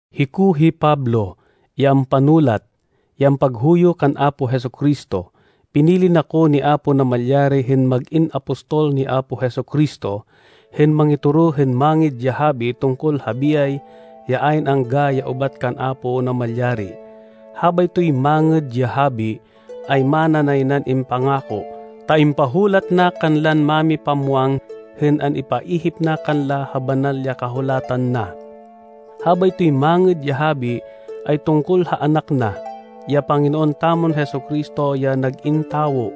Hiko hi Pablo, ya ampanulat, ya ampaghuyo kan Apo Jesu-Cristo. Pinili na ko ni Apo Namalyari hên mag-in apostol ni Apo Jesu-Cristo, hên mangitoro hên Mangêd ya Habi tungkol ha biyay ya ayn angga ya ubat kan Apo Namalyari. Habaytoy Mangêd ya Habi, ay mana nay nan impangako, ta impahulat na kanlan mámipamwang hên an-ipaihip na kanla ha Banal ya Kahulatan na. Habaytoy Mangêd ya Habi ay tungkol ha Anak na, ya Panginoon tamon Jesu-Cristo, ya nag-in tawo,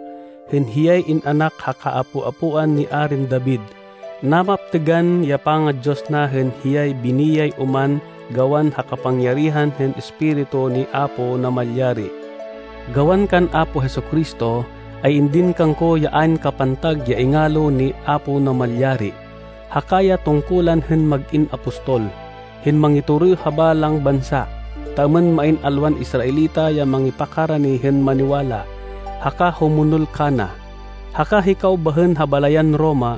hên hiyay in-anak ha kaapo-apoan ni Arin David. Napaptêgan ya panga-Diyos na hên hiyay biniyay oman gawan ha kapangyarihan hên Espiritu ni Apo Namalyari. Gawan kan Apo Jesu-Cristo, ay indin kangko ya ayn kapantag ya ingalo ni Apo Namalyari, haka ya tungkulan hên mag-in apostol, hên mangitoro ha balang bansa, ta êmên main alwan Israelita ya mangipakarani hên maniwala, haka humonol kana. Haka hikaw bahên ha balayan Roma,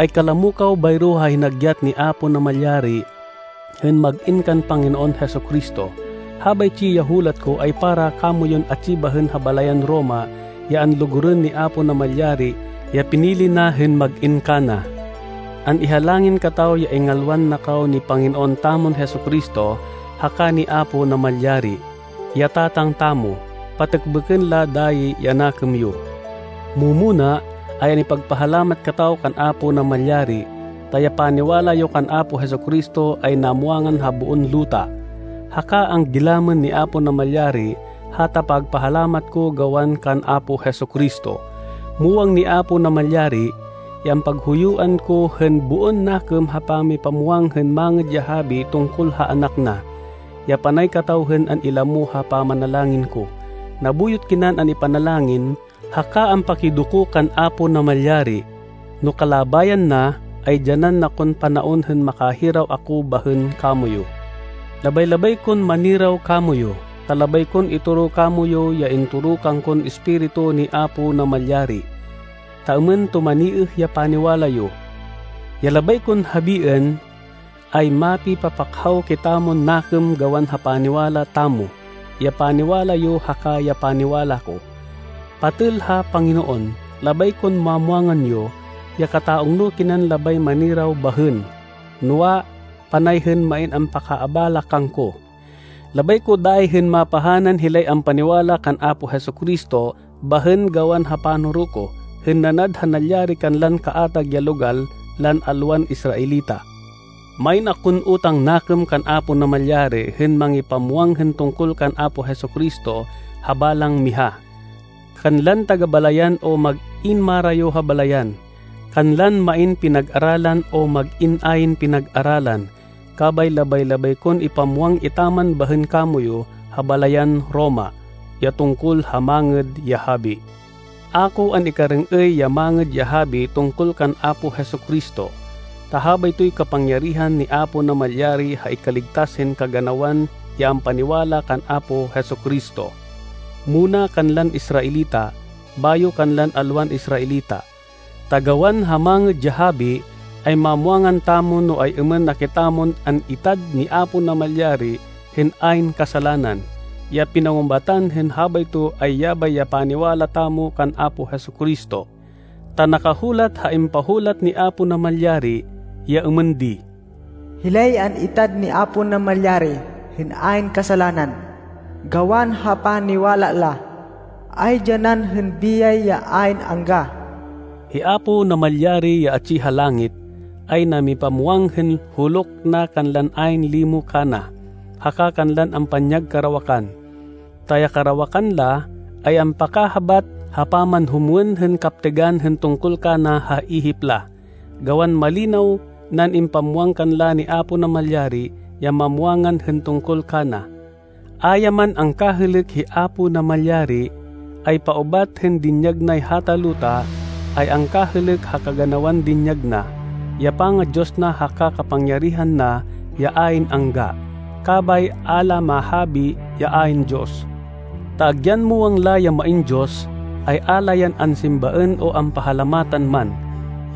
ay kalamo kaw bayro ha hinagyat ni Apo Namalyari hên mag-in kan Panginoon Jesu-Cristo. Habaytsi ya hulat ko ay para kamoyun atsi bahên ha balayan Roma ya anlugurên ni Apo Namalyari ya pinili na hên mag-in kana. An-ihalangin kataw ya ingalwan na kaw ni Panginoon tamon Jesu-Cristo haka ni Apo Namalyari, ya Tatang tamo. Patêkbêkên la dayi ya nakêm yo. Mu-muna, ay an-ipagpahalamat kataw kan Apo Namalyari, ta ya paniwala yo kan Apo Jesu-Cristo ay namwangan ha boon luta. Haka anggilamên ni Apo Namalyari hata pagpahalamat ko gawan kan Apo Jesu-Cristo. Muwang ni Apo Namalyari, ya ampaghuyuan ko hên boon nakêm ha pangipamwang hên Mangêd ya Habi tungkol ha Anak na, ya panay kataw hên an-ilamo ha pamanalangin ko. Nabuyot kinan an-ipanalangin haka ampakidoko kan Apo Namalyari, no kalabayan na, ay dyanan na kon panaon hên makahiraw ako bahên kamoyu. Labay-labay kon maniraw kamoyu, ta labay kon itoro kamoyu ya intoro kangkon Espiritu ni Apo Namalyari, ta êmên tumaniêh ya paniwala yo. Ya labay kon habiên, ay mapipapakhaw kitamon nakêm gawan ha paniwala tamo, ya paniwala yo haka ya paniwala ko. Patêl ha Panginoon, labay kon mamwangan yo, ya kata-ungno kinan labay maniraw bahên, noa, panay hên main ampakaabala kangko. Labay ko dayi hên mapahanan hilay ampaniwala kan Apo Jesu-Cristo bahên gawan ha panoro ko, hên nanad ha nalyari kanlan kaatag ya logal lan alwan Israelita. Main akon utang nakêm kan Apo Namalyari hên mangipamwang hên tungkol kan Apo Jesu-Cristo ha balang miha, kanlan taga-balayan o mag-in marayo ha balayan, kanlan main pinag-aralan o mag-in ayn pinag-aralan. Kabay labay-labay kon ipamwang etaman bahên kamoyu ha balayan Roma, ya tungkol ha Mangêd ya Habi. A ko an-ikarêng-êy ya Mangêd ya Habi tungkol kan Apo Jesu-Cristo, ta habaytoy kapangyarihan ni Apo Namalyari ha ikaligtas hên kaganawan ya ampaniwala kan Apo Jesu-Cristo. Muna kanlan Israelita, bayo kanlan alwan Israelita. Ta gawan ha Mangêd ya Habi, ay mamwangan tamo no ay-êmên na kitamon an-itad ni Apo Namalyari hên ayn kasalanan. Ya pinangubatan hên habayto ay yabay ya paniwala tamo kan Apo Jesu-Cristo. Ta nakahulat ha impahulat ni Apo Namalyari, ya êmên di, “Hilay an-itad ni Apo Namalyari hên ayn kasalanan, gawan ha paniwala la, ay dyanan hên biyay ya ayn angga.” Hi Apo Namalyari ya atsi ha langit, ay namipamwang hên huluk na kanlan ayn limo kana, haka kanlan ampanyag karawakan, ta ya karawakan la, ay ampakahabát ha pamanhumwên hên kaptêgan hên tungkol kana ha ihip la, gawan malinaw nan impamwang kanla ni Apo Namalyari ya mamwangan hên tungkol kana. A ya man angkahêlêk hi Apo Namalyari, ay paubat hên dinyag nay hata luta, ay angkahêlêk ha kaganawan dinyag na, ya panga-Diyos na haka kapangyarihan na ya ayn angga. Kabay a la mahabi ya ayn Diyos. Ta agyan muwang la ya main Diyos, ay a la yan ansimbaên o ampahalamatan man,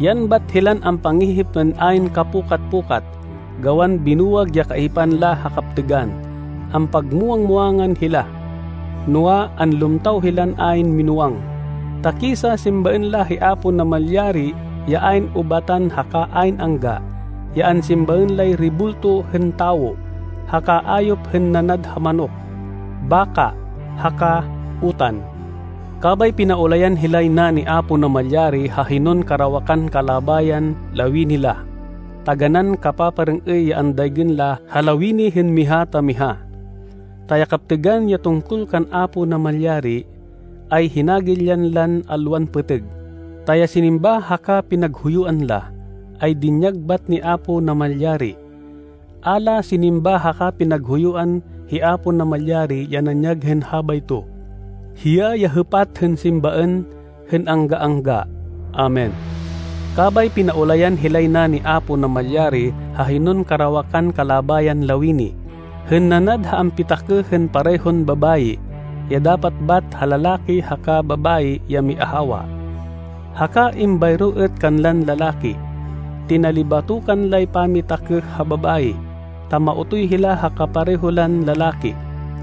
yan bat hilan ampangihip hên ayn kapukat-pukat, gawan binuwag ya kaihipan la ha kaptêgan. Ampagmuwang-muwangan hila, noa, anlumtaw hilan ayn minúwang. Ta kisa simbaên la hi Apo Namalyari ya ayn ubatan haka ayn angga, yan ansimbaên lay rebulto hên tawo, haka ayop hên nanad ha manok, baka, haka utan. Kabay pinaulayan hilay na ni Apo Namalyari ha hinon karawakan kalabayan lawini la. Taganán kapaparêng-êy ya andaygên la ha lawini hên miha ta miha. Ta ya kaptêgan ya tungkol kan Apo Namalyari, ay hinagilyan lan alwan pêtêg, ta ya sinimba haka pinaghuyuan la, ay dinyag bat ni Apo Namalyari. A la sinimba haka pinaghuyuan hi Apo Namalyari ya nanyag hên habayto. Hiya ya hêpat hên simbaên hên angga-angga! Amen. Kabay pinaulayan hilay na ni Apo Namalyari ha hinon karawakan kalabayan lawini, hên nanad ha ampitakêh hên parehon babayi, ya dapat bat ha lalaki haka babayi ya miahawa. Haka êmbayro êt kanlan lalaki, tinalibatokan lay pamakitakêh ha babayi, ta maotoy hila ha kapareho lan lalaki.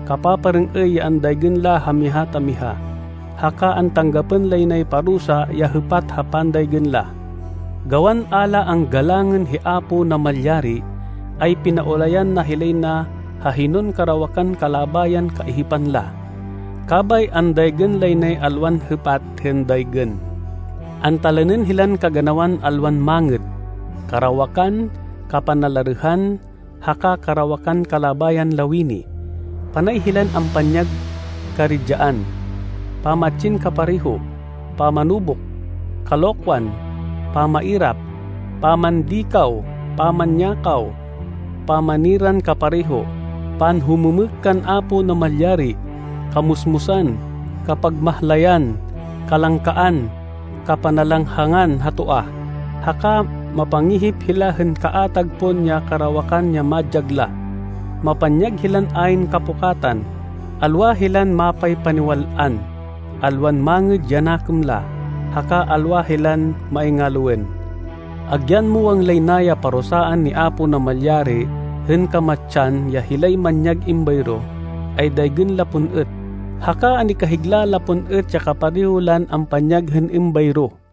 Kapaparêng-êy ya andaygên la ha miha ta miha, haka antanggapên lay nay parusa ya hêpat ha pandaygên la. Gawan a la anggalangên hi Apo Namalyari, ay pinaulayan na hilay na ha hinon karawakan kalabayan kaihipan la. Kabay andaygên lay nay alwan hêpat hên daygên. Antalanên hilan kaganawan alwan mangêd, karawakan, kapanalarêhan, haka karawakan kalabayan lawini. Panay hilan ampanyag karidyaan, pamatsin kapareho, pamanubuk, kalokwan, pamairap, pamandikaw, pamanyakaw, pamaniran kapareho, panhumêmêk kan Apo Namalyari, kamusmusan, kapagmahlayan, kalangkaan, kapanalanghangan ha toa, haka mapangihip hila hên kaatag pon ya karawakan ya madyag la. Mapanyag hilan ayn kapukatan, alwa hilan mapaypaniwal-an, alwan mangêd ya nakêm la, haka alwa hilan maingaloên. Agyan muwang lay na ya parusaan ni Apo Namalyari hên kamatsan ya hilay manyag êmbayro, ay daygên la pon êt, haka an-ikahigla la pon êt ya kapareho lan ampanyag hên êmbayro.